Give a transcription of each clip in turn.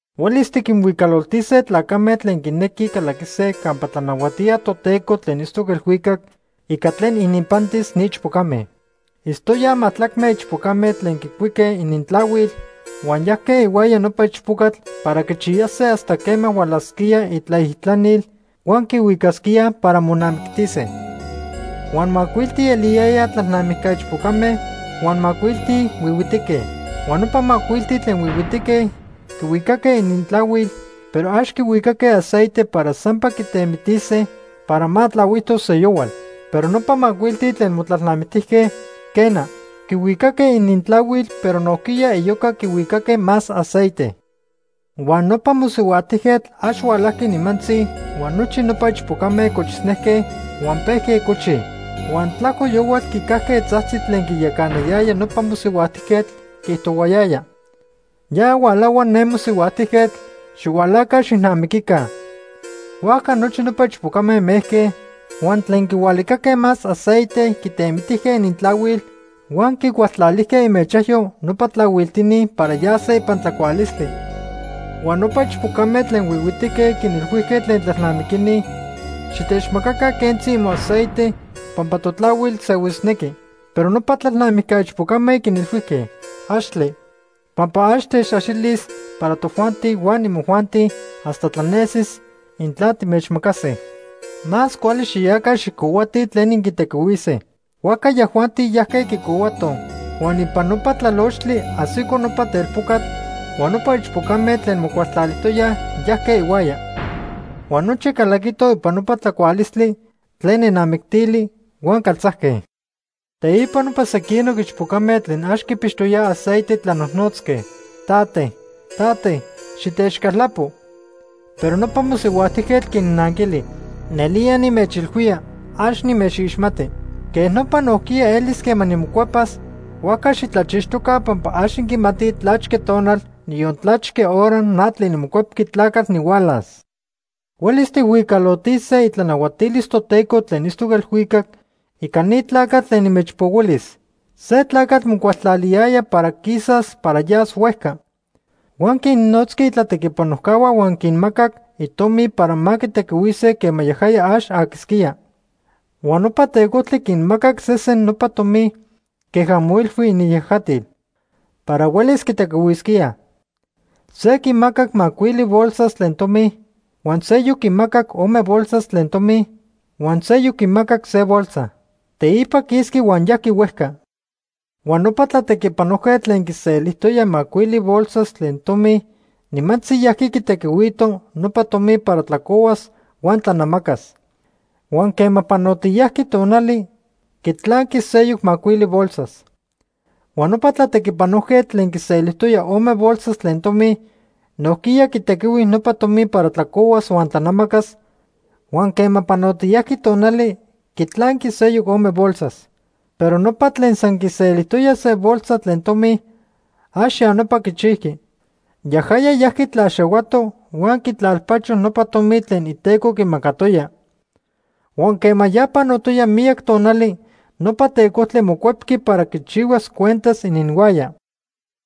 “Huelis tiquinhuicaloltise tlacame tlen quinequij calaquise campa tlanahuatía Toteco tlen itztoc elhuicac ica tlen ininpantis ni ichpocame. Itztoyaj majtlacme ichpocame tlen quicuique inintlahuil huan yajque ihuaya nopa ichpocatl para quichiyase hasta quema hualasquía itlaijtlanil huan quihuicasquía para monamictise. Huan macuilti eliyayaj tlalnamijca ichpocame huan macuilti huihuitique. Huan nopa macuilti tlen huihuitique quihuicaque inintlahuil, pero ax quihuicaque aceite para sampa quitemitise para ma tlahuijtos seyohual. Pero nopa macuilti tlen motlalnamictijque, quena. Quihuicaque inintlahuil, pero nojquiya iyoca quihuicaque más aceite. Huan nopa mosihuajtijquetl ax hualajqui nimantzi huan nochi nopa ichpocame cochisnejque huan pejque cochij. “Huan tlajco yohual quicajque tzajtzi tlen quiyacanayaya nopa mosihuajtijquetl, quiijtohuayaya: ‘Ya hualahua ne mosihuajtijquetl, xihualaca xijnamiquica.’ Huajca nochi nopa ichpocame mejque, huan tlen quihualicaque más aceite quitemitijque inintlahuil huan quicualtlalijque imechajyo nopa tlahuiltini para yase ipan tlacualistli. Huan nopa ichpocame tlen huihuitique quinilhuijque tlen tlalnamiquini: ‘Xitechmacaca quentzi imoaceite pampa totlahuil sehuisnequi.’ “Pero nopa tlalnamijca ichpocame quinilhuijque: ‘Axtle, pampa ax techaxilis para tojuanti huan imojuanti hasta tlanesis intla timechmacase. Más cuali xiyaca xijcohuatij tlen inquitequihuise.’ “Huajca yajuanti yajque quicohuatoj. Huan ipan nopa tlalochtli ajsico nopa telpocatl huan nopa ichpocame tlen mocualtlalijtoyaj yajque ihuaya. Huan nochi calaquitoj ipan nopa tlacualistli tlen nenamictili huan caltzajque. Teipa nopa sequinoc ichpocame tlen ax quipixtoyaj aceite tlanojnotzque: ‘Tate, tate, xitechcaltlapo.’ “Pero nopa mosihuajtijquetl quinnanquili: ‘Nelía nimechilhuía, ax nimechixmati.’ “Quej nopa nojquiya elis quema nimocuepas, huajca xitlachixtoca pampa ax inquimatij tlachque tonal, niyon tlachque hora, na tlen niMocuepqui Tlacatl nihualas. “Huelis tijhuicalotise itlanahuatilis Toteco tlen itztoc elhuicac, ica ni tlacatl tlen nimechpohuilis. Se tlacatl mocualtlaliyaya para quisas para yas huejca. Huan quinnotzqui itlatequipanojcahua huan quinmacac itomi para ma quitequihuise quema yajaya ax aquisquía. “Huan nopa tecojtli quinmacac sesen nopa tomi queja moilhui iniyajatil para huelis quitequihuisquíaj. Se quimacac macuili bolsas tlen tomi, huan seyoc quimacac ome bolsas tlen tomi, huan seyoc quimacac se bolsa. Teipa quisqui huan yajqui huejca. Huan nopa tlatequipanojquetl tlen quiselijtoya macuili bolsas tlen tomi nimantzi yajqui quitequihuito nopa tomi para tlacohuas huan tlanamacas. Huan quema panotiyajqui tonali, quitlanqui seyoc macuili bolsas. Huan nopa tlatequipanojquetl tlen quiselijtoya ome bolsas tlen tomi nojquiya quitequihui nopa tomi para tlacohuas huan tlanamacas huan quema panotiyajqui tonali, quitlanqui seyoc ome bolsas. Pero nopa tlen san quiselijtoya se bolsa tlen tomi, ax ya nopa quichijqui. Yajaya yajqui tlaxahuato huan quitlalpacho nopa tomi tlen iteco quimacatoya. “Huan quema ya panotoya miyac tonali, nopa tecojtli mocuepqui para quichihuas cuentas ininhuaya.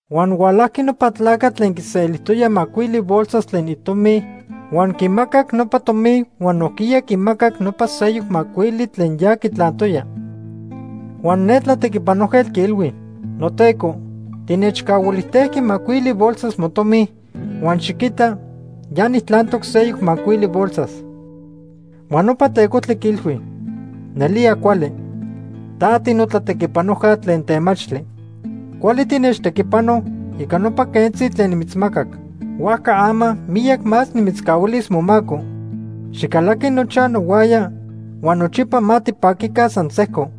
Huan hualajqui nopa tlacatl tlen quiselijtoya macuili bolsas tlen itomi huan quimacac nopa tomi huan nojquiya quimacac nopa seyoc macuili tlen ya quitlantoya. Huan ne tlatequipanojquetl quiilhui: ‘Noteco, tinechcahuilijtejqui macuili bolsas motomi, huan xiquita ya nijtlantoc seyoc macuili bolsas.’ Huan nopa tecojtli quiilhui: ‘Nelía cuali. Ta tinotlatequipanojca tlen temachtli. Cuali tinechtequipano ica nopa quentzi tlen nimitzmacac. Huajca ama miyac más nimitzcahuilis momaco. Xicalaqui nochaj nohuaya huan nochipa ma tipaquica san sejco.’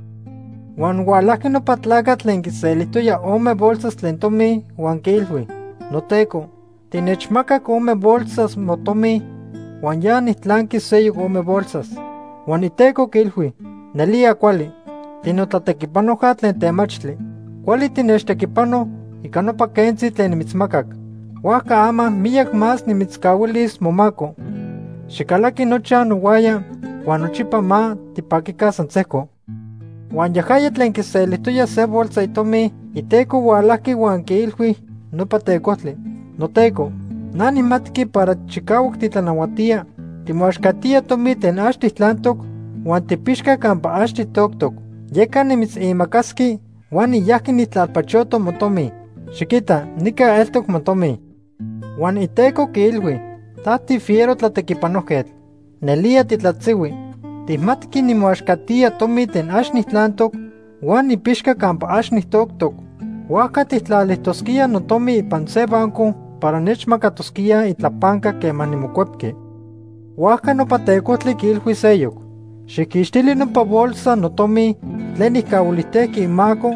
“Huan hualajqui nopa tlacatl tlen quiselijtoya ome bolsas tlen tomi huan quiilhui: ‘Noteco, tinechmacac ome bolsas motomi huan ya nijtlanqui seyoc ome bolsas.’ “Huan iteco quiilhui: ‘Nelía cuali. Tinotlatequipanojca tlen temachtli. Cuali tinechtequipano ica nopa quentzi tlen nimitzmacac. Huajca ama miyac más nimitzcahuilis momaco. Xicalaqui nochaj nohuaya huan nochipa ma tipaquica san sejco.’ “Huan yajaya tlen quiselijtoya se bolsa itomi iteco hualajqui huan quiilhui nopa tecojtli: ‘Noteco, na nijmatqui para chicahuac titlanahuatía. Timoaxcatía tomi tlen ax tijtlantoc huan tijpixca campa ax tijtoctoc. Yeca nimitzimacasqui huan niyajqui nijtlalpachoto motomi. Xiquita nica eltoc motomi.’ “Huan iteco quiilhui: ‘Ta tifiero tlatequipanojquetl. Nelía titlatzihui. Tijmatqui nimoaxcatía tomi tlen ax nijtlantoc huan nipixca campa ax nijtoctoc. Huajca tijtlalijtosquía notomi ipan se banco para nechmacatosquíaj itlapanca quema nimocuepqui.’ “Huajca nopa tecojtli quiilhui seyoc: ‘Xijquixtili nopa bolsa notomi tlen nijcahuilijtejqui imaco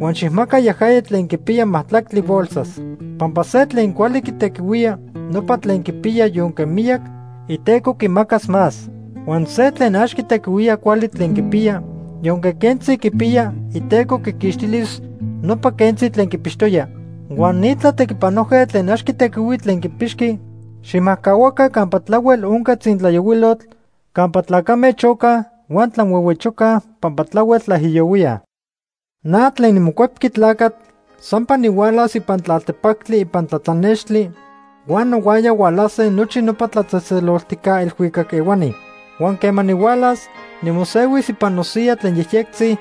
huan xijmaca yajaya tlen quipiya majtlactli bolsas. Pampa se tlen cuali quitequihuía nopa tlen quipiya yonque miyac, iteco quimacas más. Huan se tlen ax quitequihuía cuali tlen quipiya, yonque quentzi quipiya, iteco quiquixtilis nopa quentzi tlen quipixtoya. Huan ni tlatequipanojquetl tlen ax quitequihui tlen quipixqui, xijmajcahua campa tlahuel onca tzintlayohuilotl, campa tlacame chocaj huan tlanhuehuechocaj pampa tlahuel tlaijiyohuíaj.’ “Na tlen niMocuepqui Tlacatl sampa nihualas ipan tlaltepactli ipan tlatlanextli huan nohuaya hualase nochi nopa tlatzejtzeloltijca elhuicac ehuani. Huan quema nihualas, nimosehuis ipan nosiya tlen yejyectzi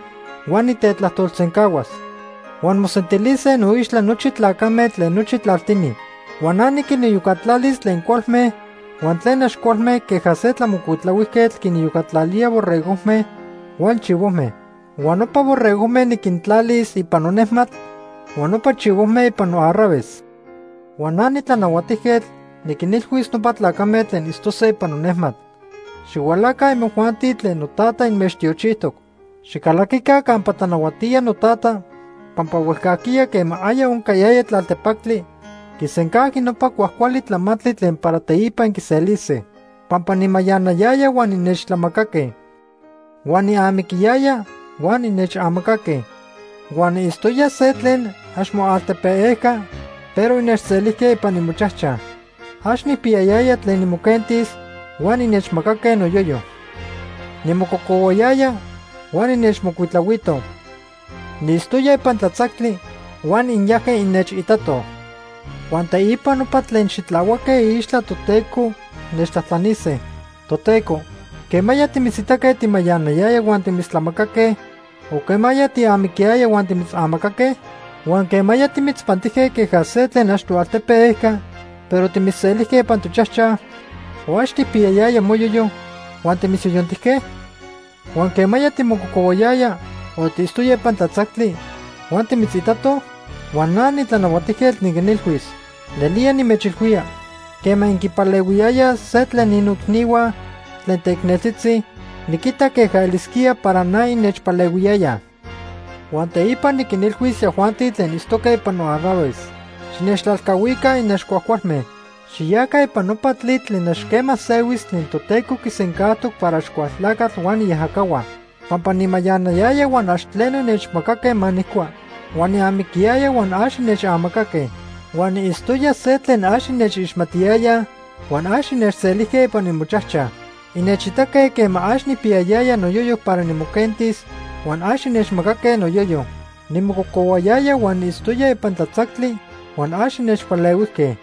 huan nitetlajtolsencahuas. Huan mosentilise noixtla nochi tlacame tlen nochi tlaltini. Huan na niquiniyocatlalis tlen cualme huan tlen ax cualme queja se tlamocuitlahuijquetl quiniyocatlalía borregojme huan chivojme. Huan nopa borregojme niquintlalis ipan nonejmatl huan nopa chivojme ipan noarraves. Huan na nitlanahuatijquetl niquinilhuis nopa tlacame tlen itztose ipan nonejmatl: ‘Xihualaca imojuanti tlen noTata inmechtiochijtoc. Xicalaquica campa tlanahuatía noTata, pampa huejcajquiya quema aya oncayaya tlaltepactli, quisencajqui nopa cuajcuali tlamantli tlen para teipa inquiselise. Pampa nimayanayaya huan innechtlamacaque. Huan niamiquiyaya huan innechamacaque. Huan niitztoya se tlen ax moaltepe ejca, pero innechselijque ipan imochajchaj. Ax nijpiyayaya tlen nimoquentis huan innechmacaque noyoyo. Nimococohuayaya huan innechmocuitlahuitoj. Niitztoya ipan tlatzactli huan inyajque innechitatoj.’ “Huan teipa nopa tlen xitlahuaque iixtla Toteco nechtlajtlanise: ‘Toteco, ¿quemaya timitzitaque timayanayaya huan timitztlamacaque, o quema tiamiquiyaya huan timitzamacaque? Huan ¿quemaya timitzpantijque queja se tlen ax toaltepe ejca, pero timitzselijque ipan tochajchaj, o ax tijpiyayaya moyoyo huan timitzyoyontijque? Huan ¿quemaya timococohuayaya o tiitztoya ipan tlatzactli huan timitzitatoj?’ “Huan na niTlanahuatijquetl niquinilhuis: ‘Nelía nimechilhuía, quema inquipalehuiyayaj se tlen ni noicnihua tlen teicneltzitzi, niquitac queja elisquía para na innechpalehuiyayaj.’ “Huan teipa niquinilhuis yajuanti tlen itztoque ipan noarraves: ‘Xinechtlalcahuica inaxcuajcualme. Xiyaca ipan nopa tlitl tlen ax quema sehuis tlen Toteco quisencajtoc para Axcualtlacatl huan iajacahua. Pampa nimayanayaya huan ax tleno innechmacaque ma nijcua, huan niamiquiyaya huan ax innechamacaque. Huan niitztoya se tlen ax innechixmatiyayaj, huan ax innechselijque ipan imochajchaj. Innechitaque quema ax nijpiyayaya noyoyo para nimoquentis, huan ax innechmacaque noyoyo. Nimococohuayaya huan niitztoya ipan tlatzactli huan ax innechpalehuijque.’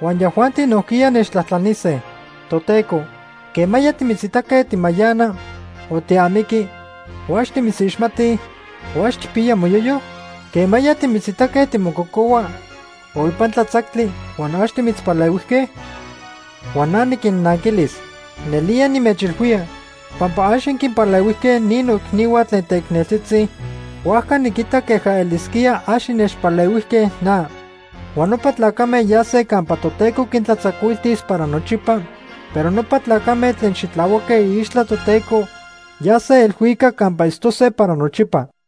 “Huan yajuanti nojquiya nechtlajtlanise: ‘Toteco, ¿quemaya timitzitaque timayana, o tiamiqui, o ax timitzixmati, o ax tijpiya moyoyo? ¿Quemaya timitzitaque timococohua o ipan tlatzactli huan ax timitzpalehuijque?’ “Huan na niquinnanquilis: ‘Nelía nimechilhuía, pampa ax inquinpalehuijque ni noicnihua tlen teicneltzitzi, huajca niquita queja elisquía ax innechpalehuijque na.’ “Huan nopa tlacame yase campa Toteco quintlatzacuiltis para nochipa, pero nopa tlacame tlen xitlahuaque iixtla Toteco yase elhuicac campa itztose para nochipa.”